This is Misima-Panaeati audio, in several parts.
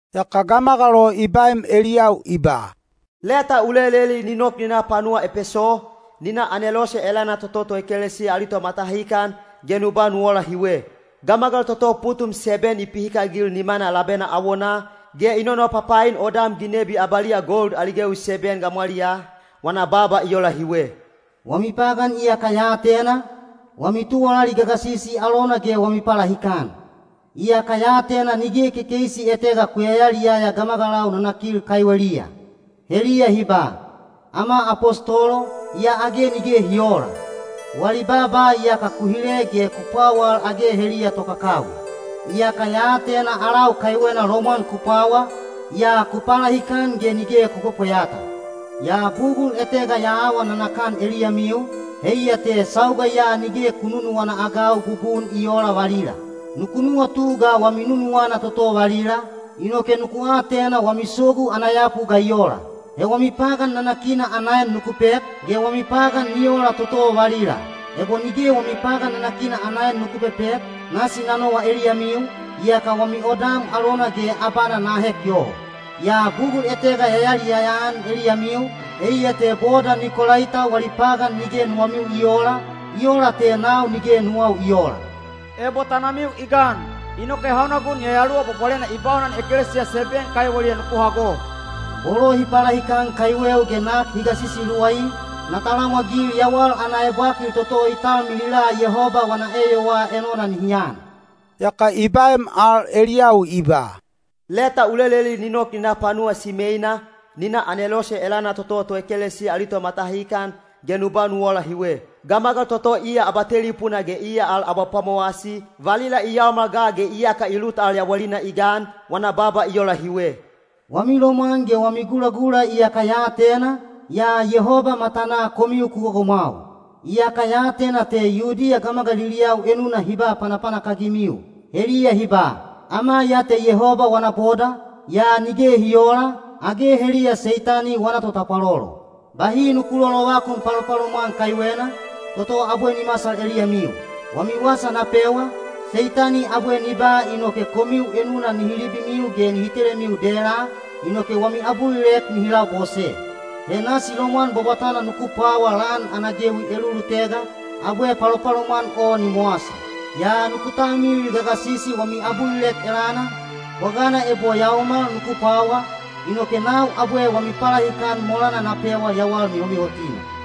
Yaka gamagal o i baem eliyau i ba, “Leta u leleli ni nok ni na panuwa Epeso, ni na anelose elana toto toekelesiya ali tomatahikan, ge nu ba nu ola hiwe: Gamagal toto putum seben i pihikagil nimana labena awonaa, ge i nonopapain odam ginebi abaliya gold ali gewi seben gamwaliyaa, wana baaba i ola hiwe. Wami pagan iyaka ya atena, wami tuwalali gagasisi alona ge wami palahikan. Iyaka ya atena nige kekeisi etega ku yayaliyaya gamagalau nanakil kaiweliya. Heliya hi ba, ‘Ama apostolo,’ yaa age nige hi oola. Wali baaba iyaka ku hile ge ku pwawal age heliya tokakawi. Iyaka ya atena alau kaiwena lomwan ku pwawa, yaa ku palahikan ge nige ku pwepweyata. Yaa bugul etega ya awa nanakan eliyamiu, heiya te sauga ya nige ku nunuwana-agau bubun i oola valila. Nuku nuwatu ga wami nunuwana toto valila, inoke nuku atena wami sogu ana yapu ga i ola. He wami pagan nanakina ana en nuku pek, ge wami pagan ni ola toto valila. Ebo nige wami pagan nanakina ana en nuku pepek, nasi na nowa eliyamiu, yaka wami odam alona ge abana na ahek yoho. Yaa bugul etega ya yaliyaya-an eliyamiu, heiya te boda Nikolaita wali pagan nige nuwamiu i oola, i ola te nau nige nuwau i oola. Ebo tanamiu i gan, inoke hauna gun Yayaluwa Bwabwalena i baunan ekelesiya seben kaiweliya nuku hago. Bolo hi palahikan kaiweu ge nak hi gasisi luwai, na talamwagil yawal ana ebwakil toto i talmilila Yehoba wana eyowaa enona nihi an.” Yaka i baem al eliyau i ba, “Leta u leleli ni nok ni na panuwa Simeina, ni na anelose elana toto toekelesiya ali tomatahikan, ge nu ba nu ola hiwe: Gamagal toto iya Abatelipuna ge iya al Abapwamowasi, valila i yaomal ga ge iyaka i lut al yawalina i gan, wana baaba i ola hiwe. Wami lomwan ge wami gulagula iyaka ya atena, yaa Yehoba matanaa komiu ku gogomwau. Iyaka ya atena te Yudiya gamagaliliyau enuna hi ba panapanak-agimiu. Heliya hi ba, ‘Ama ya te Yehoba wana boda,’ yaa nige hi oola, age heliya Seitani wana totapwalolo. Bahi nuku lolovakun palopalomwan kaiwena, toto abwe ni masal eliyamiu. Wami wasa na pewa, Seitani abwe ni ba inoke komiu enuna nihi libimiu ge nihi telemiu dela, inoke wami abulilek nihi labose. He nasi lomwan bwabwatana nuku pwawa lan ana gewi elulutega, abwe palopalomwan o ni mowasi. Yaa nuku talmilil gagasisi wami abulilek elana, bwagana ebo yaomal nuku pwawa, inoke nau abwe wami palahikan molana na pewa yawal mihomihotina.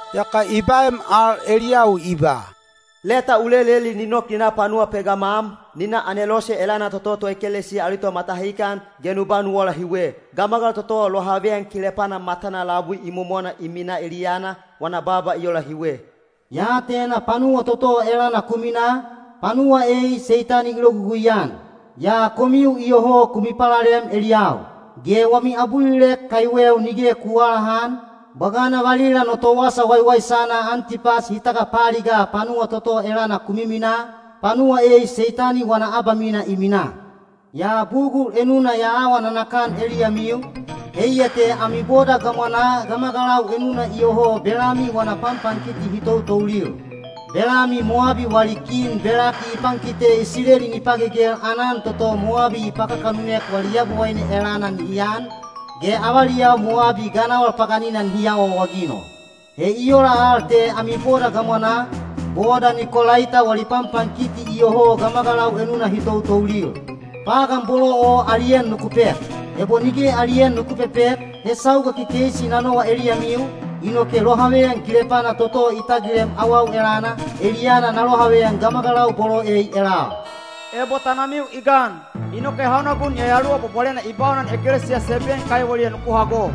Yaka i baem al eliyau i ba, “Leta u leleli ni nok ni na panuwa Pegamam, ni na anelose elana toto toekelesiya ali tomatahikan, ge nu ba nu ola hiwe: Gamagal toto lohaveyan kilepana matana labui imomona i minaa eliyana, wana baaba i ola hiwe. Ya atena panuwa toto elana ku minaa, panuwa ei Seitani i logugui-an. Yaa komiu iyoho ku mipalalem eliyau. Ge wami abulilek kaiweu nige ku aalahan, bwagana valila no towasa waiwaisana Antipas hi tagapaaligaa panuwa toto elana ku miminaa, panuwa ei Seitani wana abamina i minaa. Yaa bugul enuna ya awa nanakan eliyamiu, heiya te ami boda gamwanaa gamagalau enuna iyoho Belami wana panpankiti hi toutoulil. Belami Mowabi wali kin Belaki i pankite Isileli ni pagegel aanan toto Mowabi hi pakakanunek wali yabowaine elana nihi an, ge avaliyau Mowabi ganawal paganina nihi awaawaginol. He i ola al te ami boda gamwanaa, boda Nikolaita wali panpankiti iyoho gamagalau enuna hi toutoulil. Pagan bolo o ali en nuku pek. Ebo nige ali en nuku pepek, he sauga kekeisi na nowa eliyamiu, inoke lohaveyan kilepana toto i tagilem awau elana, eliyana na lohaveyan gamagalau bolo ei elal. Ebo tanamiu i gan, inoke hauna gun Yayaluwa Bwabwalena i baunan ekelesiya seben kaiweliya nuku hago.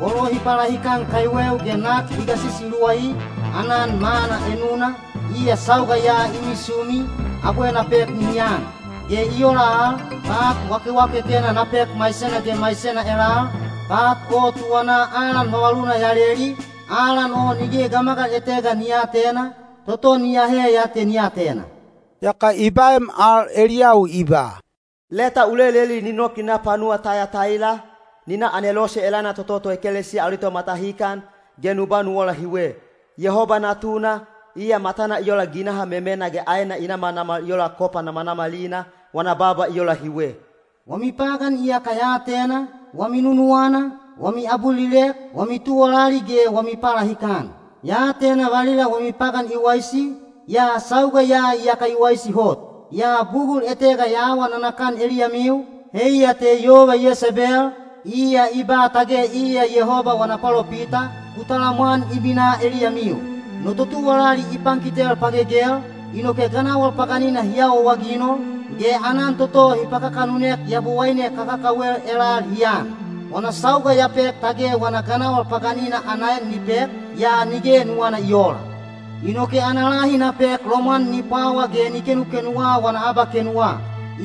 Bolo hi palahikan kaiweu ge nak hi gasisi luwai, aanan manna enuna, iya sauga ya i misumi, abwe na pek nihi an. Ge i ola al, pat wakewakekena na pek maisena ge maisena elal, pat o tuwanaa alan vavaluna ya leli, alan o nige gamagal etega ni aatena, toto ni ahe ya te ni atena.” Yaka i baem al eliyau i ba, “Leta u leleli ni nok ni na panuwa Tayataila, ni na anelose elana toto toekelesiya ali tomatahikan, ge nu ba nu ola hiwe: Yehoba Natuna, iya matana i ola ginaha memena ge aena i namanamal i ola kopa namanamalina, wana baaba i ola hiwe. Wami pagan iyaka ya atena, wami nunuwana, wami abulilek, wami tuwalali ge wami palahikan. Ya atena valila wami pagan i waisi, yaa sauga ya iyaka i waisi hot. Yaa bugul etega ya awa nanakan eliyamiu, heiya te yova Yesebel, iya i ba tage iya Yehoba wana palopita, ku talamwan i minaa eliyamiu. No totuwalali i pankitel pagegel, inoke ganawal paganina hi awaawaginol, ge aanan toto hi pakakanunek yabowaine kakakawel elal hi an. Wana sauga ya pek tage wana ganawal paganina ana en ni pek, yaa nige nuwana i oola. Inoke ana lahi na pek lomwan ni pwawa ge ni kenukenuwa wana abakenuwa.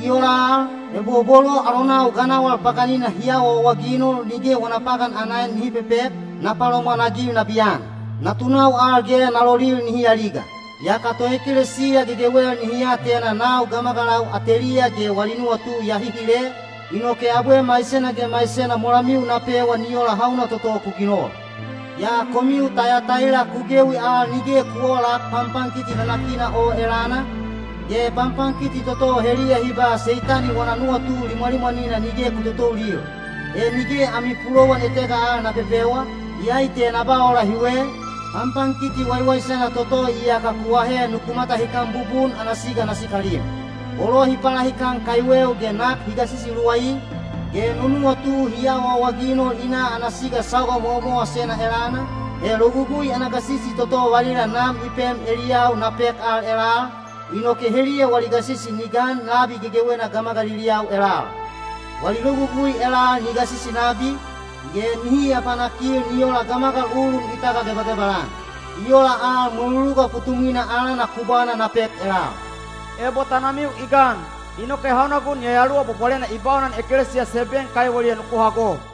I ola al, ebo bolo alonau ganawal paganina hi awaawaginol nige wana pagan ana en nihi pepek, na palomwanagil nabiyan. Natunau al ge na lolil nihi aliga. Yaka toekelesiya gegewel nihi atena nau gamagalau ateliya ge wali nuwatu ya hihile, inoke abwe maisena ge maisena molamiu na pewa ni ola hauna toto ku ginol. Yaa komiu Tayataila ku gewi al nige ku oolak panpankiti nanakina o elana, ge panpankiti toto heliya hi ba ‘Seitani wana nuwatu limwalimwanina’ nige ku totoulil. He nige ami pulowan etega al na pepewa, iyai te na ba ola hiwe, ‘Panpankiti waiwaisana toto iyaka ku ahe nuku matahikan bubun ana siga na sikalim.’ Bolo hi palahikan kaiweu ge nak hi gasisi luwai, ge no nuwatu hi awaawaginol i na ana siga sauga mowamowasena elana, he logugui ana gasisi toto valila Nam i pem eliyau na pek al elal, inoke heliya wali gasisi ni gan labi gegewena gamagaliliyau elal. Wali logugui elal ni gasisi nabi, ge nihi apapanak-agil ni ola gamagal ulun i tagagebagebal-an. I ola al mweluluga putumwina alana kubwana na pek elal. Ebo tanamiu i gan, inoke hauna gun Yayaluwa Bwabwalena i baunan ekelesiya seben kaiweliya nuku hago.”